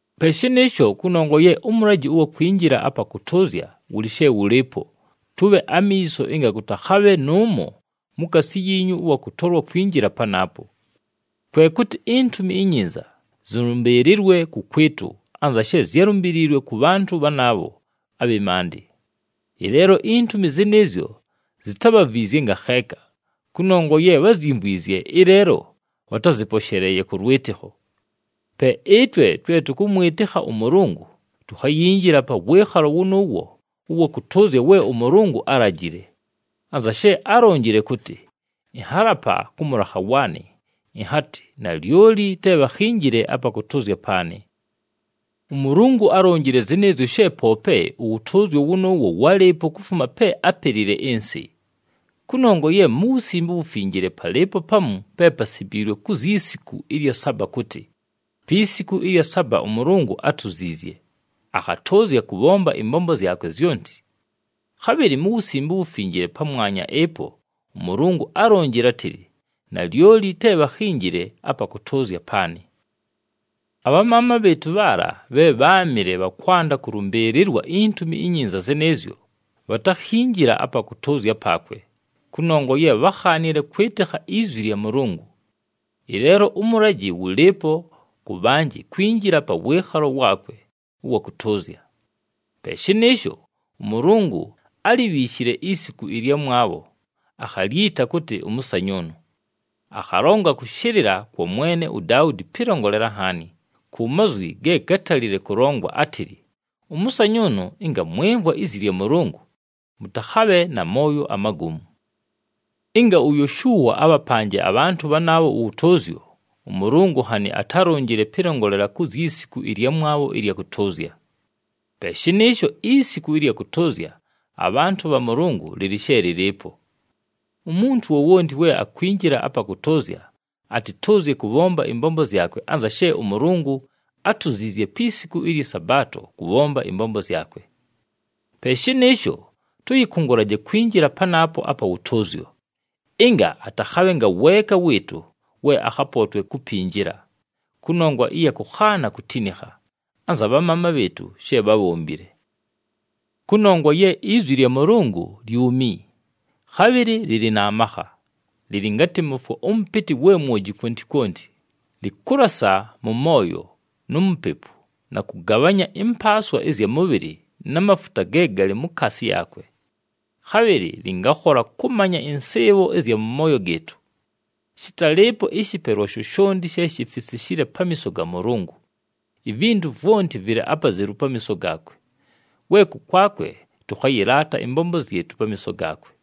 Pe shɨnɨɨsho, kʉnongwa ye ʉmʉlajɨ ʉwa kwinjila apa kʉtʉʉzya wʉlɨ she wʉlɨɨpo, tʉbhe amiiso ɨnga kʉtakhabhe nʉʉmo mukaasi yiinyu ʉwa kʉtolwa kwinjila panaapo. Kwe kʉtɨ iNtumi iNyinza zɨlʉmbɨɨlɨlwe kʉkwɨtʉ anza she zyálumbiliilwe kʉ bhantʉ bhanaabho abhɨ maandɨ. Ɨleelo intumi zɨnɨɨzyo zitábhavwizye ngakheeka, kʉnongwa ye bházyimvwizye, ɨleelo bhatázɨposheleeye kʉ lwɨtɨkho. Pe ɨtwe twe tʉkʉmwɨtɨkha ʉMʉlʉngʉ tukhayinjila pa wɨɨkhalo wʉnʉʉwo ʉwa kʉtʉʉzya we ʉMʉlʉngʉ álajile. Anza she álonjile kʉtɨ, “Ɨnhalapa kʉ mʉlakha waanɨ, ɨnhatɨ, ‘Nalyoli te bhakhinjile apa kʉtʉʉzya paanɨ.’” ɄMʉlʉngʉ álonjile zɨnɨɨzyo she poope ʉwʉtʉʉzyo wʉnʉʉwo wálɨɨpo kufuma pe ápelile ɨnsɨ. Kʉnongwa ye mu Wusimbe uWufinjile palɨɨpo pamu pe pasimbiilwe ku zyi siku ɨlya saba kʉtɨ, “Pi siku ɨlya saba ʉMʉlʉngʉ átuziizye, akhatʉʉzya kʉbhomba ɨmbombo zyakwe zyonti.” Khabhɨlɨ mu Wusimbe uWufinjile pamwanya ɨpo, ʉMʉlʉngʉ álonjile átɨlɨ, “Nalyoli te bhakhinjile apa kʉtʉʉzya paanɨ.” Abhamaama bhɨɨtʉ bhaala bhe bháamɨle bha kwanda kʉlʉmbɨɨlɨlwa iNtumi iNyinza zɨnɨɨzyo, bhatakhinjila apa kʉtʉʉzya paakwe, kʉnongwa ye bhákhaanile kwɨtɨkha izwi lya Mʉlʉngʉ. Ɨleelo ʉmʉlajɨ wʉlɨɨpo kʉ bhanjɨ kwinjila pa wɨɨkhalo waakwe ʉwa kʉtʉʉzya. Pe shɨnɨɨsho, ʉMʉlʉngʉ álibhiishile isiku ɨlyamwabho, akhalyita kʉtɨ, “ʉmʉsanyʉʉnʉ.” Akhalonga kʉshɨlɨla kwa mwene uDaudi pɨlongolela nhaani, ku mazwi ge gátalile kʉlongwa, átɨlɨ, “Ʉmʉsanyʉʉnʉ, ɨnga mwɨmvwa izi lya Mʉlʉngʉ, mʉtakhabhe na mooyo amagomu.” Ɨnga uYoshua abhapanje abhantʉ bhanaabho ʉwʉtʉʉzyo, ʉMʉlʉngʉ nhanɨ atálonjile pɨlongolela ku zyi siku ɨlyamwabho ɨlya kʉtʉʉzya. Pe shɨnɨɨsho isiku ɨlya kʉtʉʉzya abhantʉ bha Mʉlʉngʉ lɨlɨ she lɨlɨɨpo. Umuntu wowonti we akwinjila apa kʉtʉʉzya, atɨtʉʉzye kʉbhomba ɨmbombo zyakwe anza she ʉMʉlʉngʉ átuziizye pi siku ɨlyɨ Sabaato kʉbhomba ɨmbombo zyakwe. Pe shɨnɨɨsho, tʉyɨkʉngʉlaje kwinjila panaapo apa wʉtʉʉzyo, ɨnga atakhabhe ngaweeka wɨɨtʉ we akhapootwe kupinjila, kʉnongwa ɨya kʉkhaana kutinikha, anza bhamaama bhɨɨtʉ she bhábhombile. Kʉnongwa ye izwi lya Mʉlʉngʉ lyumi, khabhɨlɨ lɨlɨ na makha, lɨlɨ ngatɨ mʉfwo ʉmʉpɨtɨ we mwoji kwonti kwonti, lɨkʉlasa mʉ mooyo nu mupepu, na kʉgabhanya ɨmpaaswa ɨzya mʉbhɨlɨ na mafuta ge galɨ mukaasi yaakwe. Khabhɨlɨ lɨngakhola kʉmanya ɨnsɨɨbho ɨzya mʉ mooyo gɨɨtʉ. Shɨtalɨɨpo ɨshɨpelwa shoshonti she shifisishile pamiiso ga Mʉlʉngʉ. Ivintu vwonti vɨlɨ apazelu pamiiso gaakwe, we kʉkwakwe tʉkhayɨlaata ɨmbombo zyɨtʉ pamiiso gaakwe.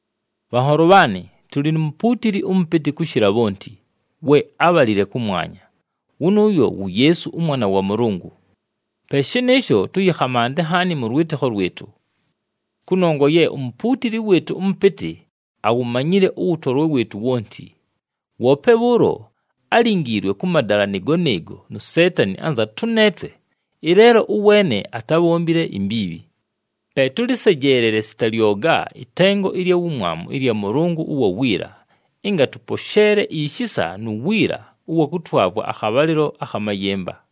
Bhanholo bhaanɨ, tʉlɨ nu mupuutili ʉmʉpɨtɨ kʉshɨla bhonti, we ábhalile kʉmwanya, wʉnʉʉyo wu Yeesu ʉMwana wa Mʉlʉngʉ. Pe shɨnɨɨsho, tʉyɨkhamante nhaani mʉ lwɨtɨkho lwɨtʉ. Kʉnongwa ye uMupuutili wɨɨtʉ ʉMʉpɨtɨ awumanyile ʉwʉtolwe wɨɨtʉ wonti. Woope bhʉʉlo álingiilwe kʉ madala nɨɨgo nɨɨgo nu Seetani anza tʉneetwe, ɨleelo ʉweene atábhombile imbiibhi. Pe tʉlɨsejeelele sita lyoga ɨtengo ɨlya wumwamu ɨlya Mʉlʉngʉ ʉwa wiila, ɨnga tʉposheele ishisa nu wiila ʉwa kʉtwavwa akhabhalɨlo akha mayɨmba.